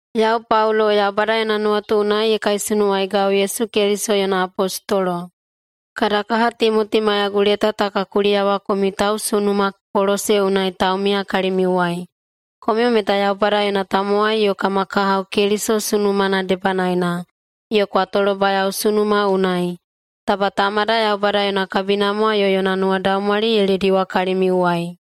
Yau Paulo, Yaubada yona nuwatu unai ye kaisunuwaigau Yesu Keliso yona apostolo. Kada kaha Timoti maiyagu leta ta ka kuliyawa komiu tausunuma Kolose unai taumiya kalimiuwai. Komiu meta Yaubada yona tamowai yo kama kahao Keliso sunumana debanaena, yo kwa tolobayao sunuma unai. Taba Tamada Yaubada yona kabinamwa yo yona nuwadaumwali ye lediwa kalimiuwai.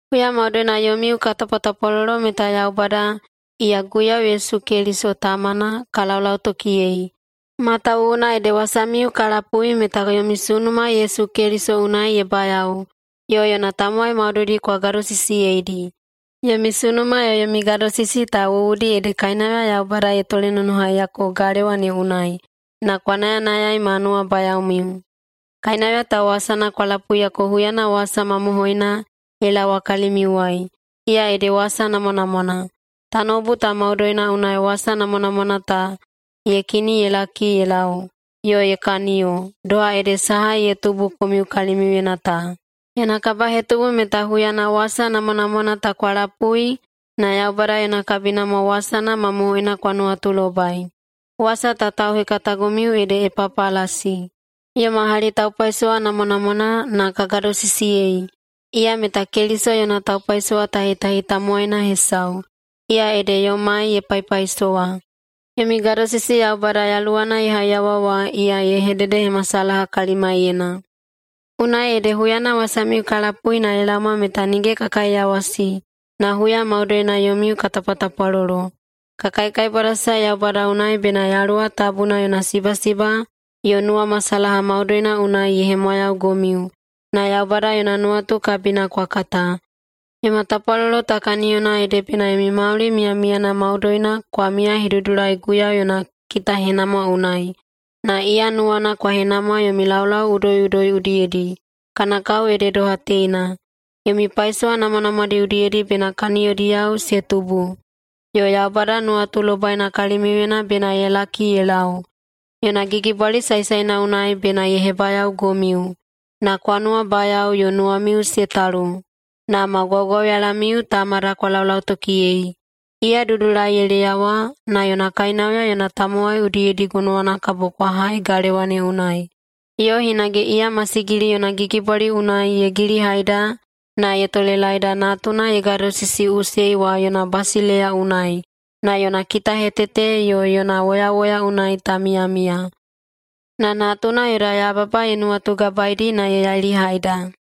Huya maudoina yomiu ka tapwatapwalolo meta Yaubada, iya Guiyau Yesu Keliso Tamana, ka laulautokiyei, matawuwuna ede wasamiu ka lapui meta yomi sunuma Yesu Keliso unai ye bayao, yo yona tamowai maudoidi kwa gadosisiyeidi. Yomi sunuma yo yomi gadosisi ta wuwudi ede kainauya Yaubada ye tolenonohaiyako galewa ne unai na kwa nayanayai ma nuwabayaomiu. Kainauya ta wasana kwa lapuiyako huyana wasa mamohoina ye laowa kalimiuwai, iya ede wasa namwanamwana. Tanoubu ta maudoina unai wasa namwanamwana ta ye kini ye laki ye lau, yo ye kaniyo, doha ede saha ye tubu komiu kalimiuyena ta. Yona kabahetubu meta huyana wasa namwanamwana ta kwa lapui na Yaubada yona kabinamwa wasana mamohoina kwa nuwatulobai. Wasa ta tauhekatagomiu ede Epapalasi, yoma hali taupaisowa namwanamwana, na ka gadosisiyei. Iya meta Keliso yona taupaisowatahitahi tamowaina hesau, iya ede yomai ye paipaisowa. Yomi gadosisi Yaubada Yaluwana ye haiyawa wa iya ye hededehemasalaha kalimaiyena. Unai ede huyana wasamiu ka lapui na ye laoma meta nige ka kaiyawasi, na huya maudoina yomiu ka tapwatapwalolo. Ka kaikaibwadasae Yaubada unai bena Yaluwa Tabuna yona sibasiba yo nuwamasalaha maudoina unai ye hemwayaugomiu na Yaubada yona nuwatu kabina kwa kata. [Yoma tapwalolo ta kaniyona ede] bena yomi mauli miyamiyana maudoina kwa miyahedudulai Guiyau yona kitahenamwa unai, na iya nuwana kwa henamwa yomi laulau udoiꞌudoi udiyedi, [kana kao ede doha teina:] Yomi paisowa namwanamwadi udiyedi bena kaniyodiyao se tubu, yo Yaubada nuwatulobaina kalimiuyena bena ye laki ye lau. Yona gigibwali saesaena unai bena ye hebayaogomiu na kwa nuwabayao yo nuwamiu se talu. Na ma gwaugwauyalamiu Tamada kwa laulautokiyei. Iya dudulai ye leyawa na yona kainauya yona tamowai udiyedi gonowana kabo kwa hai galewa ne unai. Yo hinage iya masigili yona gigibwali unai ye gilihaida na ye tolelaeda Natuna ye gadosisiꞌusei wa yona basileiya unai [na yona kitahetete yo yona woyawoya unai ta miyamiya]. Na Natuna yoda yababa ye nuwatugabaeidi na ye yailihaida.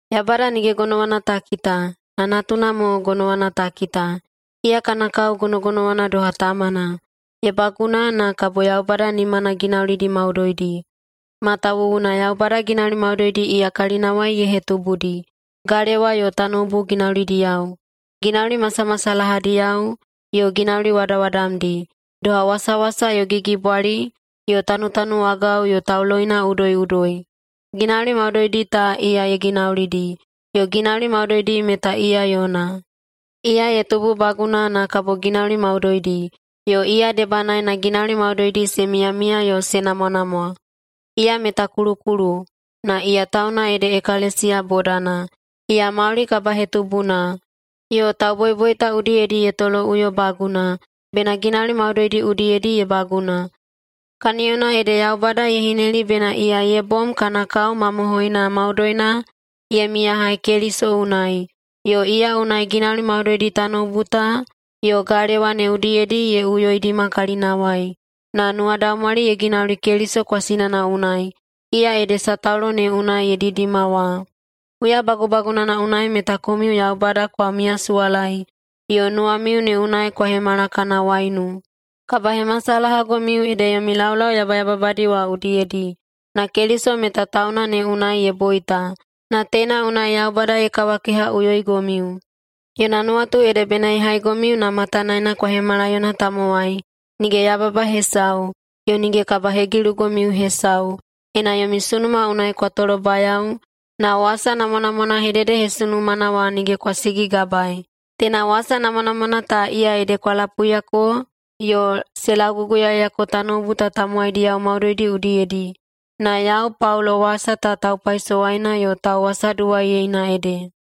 Yaubada nige gonowana ta kita, na Natuna mo gonowana ta kita. Iya kana kao gonogonowana doha Tamana, ye baguna na kabo Yaubada nimana ginaulidi maudoidi, matawuwuna Yaubada ginauli maudoidi iya kalinawai ye hetubudi, galewa yo tanoubu ginaulidiyao, ginauli masamasalahadiyao yo ginauli wadawadamdi, doha wasawasa yo gigibwali yo tanutanuwagao yo tauloina udoiꞌudoi. Ginauli maudoidi ta iya ye ginaulidi, yo ginauli maudoidi meta iya yona. Iya ye tububaguna na kabo ginauli maudoidi, yo iya debanaena ginauli maudoidi se miyamiya yo se namwanamwa. Iya meta kulukulu, na iya tauna ede ekalesiya bodana. Iya mauli kabahetubuna, yo tauboiboita udiyedi ye toloꞌuyobaguna, bena ginauli maudoidi udiyedi ye baguna, kaniyona ede Yaubada ye hineli bena iya ye bom kana kao mamohoina maudoina ye miyahai Keliso unai, yo iya unai ginauli maudoidi tanoubu ta yo galewa ne udiyedi ye uyoidima kalinawai, na nuwadaumwali ye ginauli Keliso kwasinana unai, iya ede sataulo ne unai ye didima wa. Huya bagubagunana unai meta komiu Yaubada kwa miyasuwalaei yo nuwamiu ne unai kwa hemala kana waiunu, kabahemasalahagomiu ede yomi laulau yabayababadi wa udiyedi. Na Keliso meta tauna ne unai ye boita, na teina unai Yaubada ye kawakehaꞌuyoigomiu. Yona nuwatu ede bena ye haigomiu na matanaena kwa hemala yona tamowai, nige yababa hesau, yo nige kabahegilugomiu hesau, ena yomi sunuma unai kwa tolobayao na wasa namwanamwana hededehesunumana wa nige kwa sigigabaei. Teina wasa namwanamwana ta, iya ede kwa lapuiyako yo se lauguguyaeyako tanoubu ta tamowaidiyao maudoidi udiyedi. Na yau Paulo wasa ta taupaisowaina yo tauwasaduwaiyeina ede.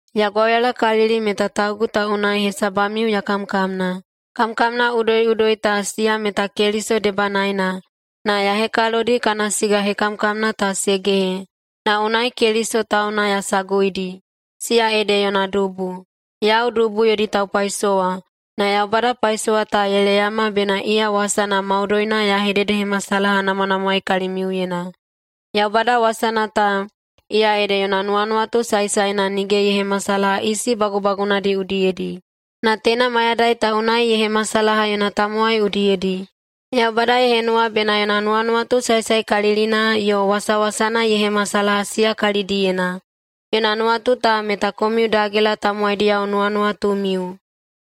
Ya gwauyalakalili meta taugu ta unai hesabamiu ya kamkamna. Kamkamna udoiꞌudoi ta, siya meta Keliso debanaena, na ya hekalodi kana siga hekamkamna ta se gehe, na unai Keliso tauna ya saguidi, siya ede yona dubu. Yau dubu yodi taupaisowa. Na Yaubada paisowa ta ye leyama bena iya wasana maudoina ya hededehemasalahanamwanamwaei kalimiuyena. Yaubada wasana ta, iya ede yona nuwanuwatu saesaena nige ye hemasalaha isi bagubagunadi udiyedi, na teina mayadai ta unai ye hemasalaha yona tamowai udiyedi. Yaubada ye henuwa bena yona nuwanuwatu saesaekalilina yo wasawasana ye hemasalaha siya kalidiyena. Yona nuwatu ta meta komiu dagela tamowaidiyao nuwanuwatumiu,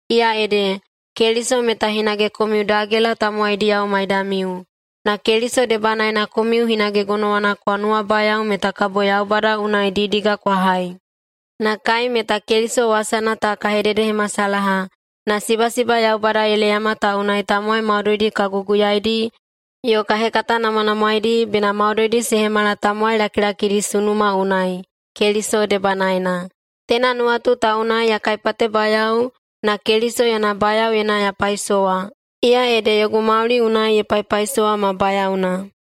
iya ede: Keliso meta hinage komiu dagela tamowaidiyao maidamiu. Na Keliso debanaena komiu hinage gonowana kwa nuwabayao meta kabo Yaubada unai didiga kwa hai. Na kai meta Keliso wasana ta ka hededehemasalaha, na sibasiba Yaubada ye leyama ta unai tamowai maudoidi ka guguyaidi yo ka hekatanamwanamwaedi, bena maudoidi se hemala tamowai lakilakidi sunuma unai, Keliso debanaena. Teina nuwatu ta unai ya kaipatebayao na Keliso yona bayaoyena ya paisowa, iya ede yogu mauli unai ye paipaisowa ma bayaona.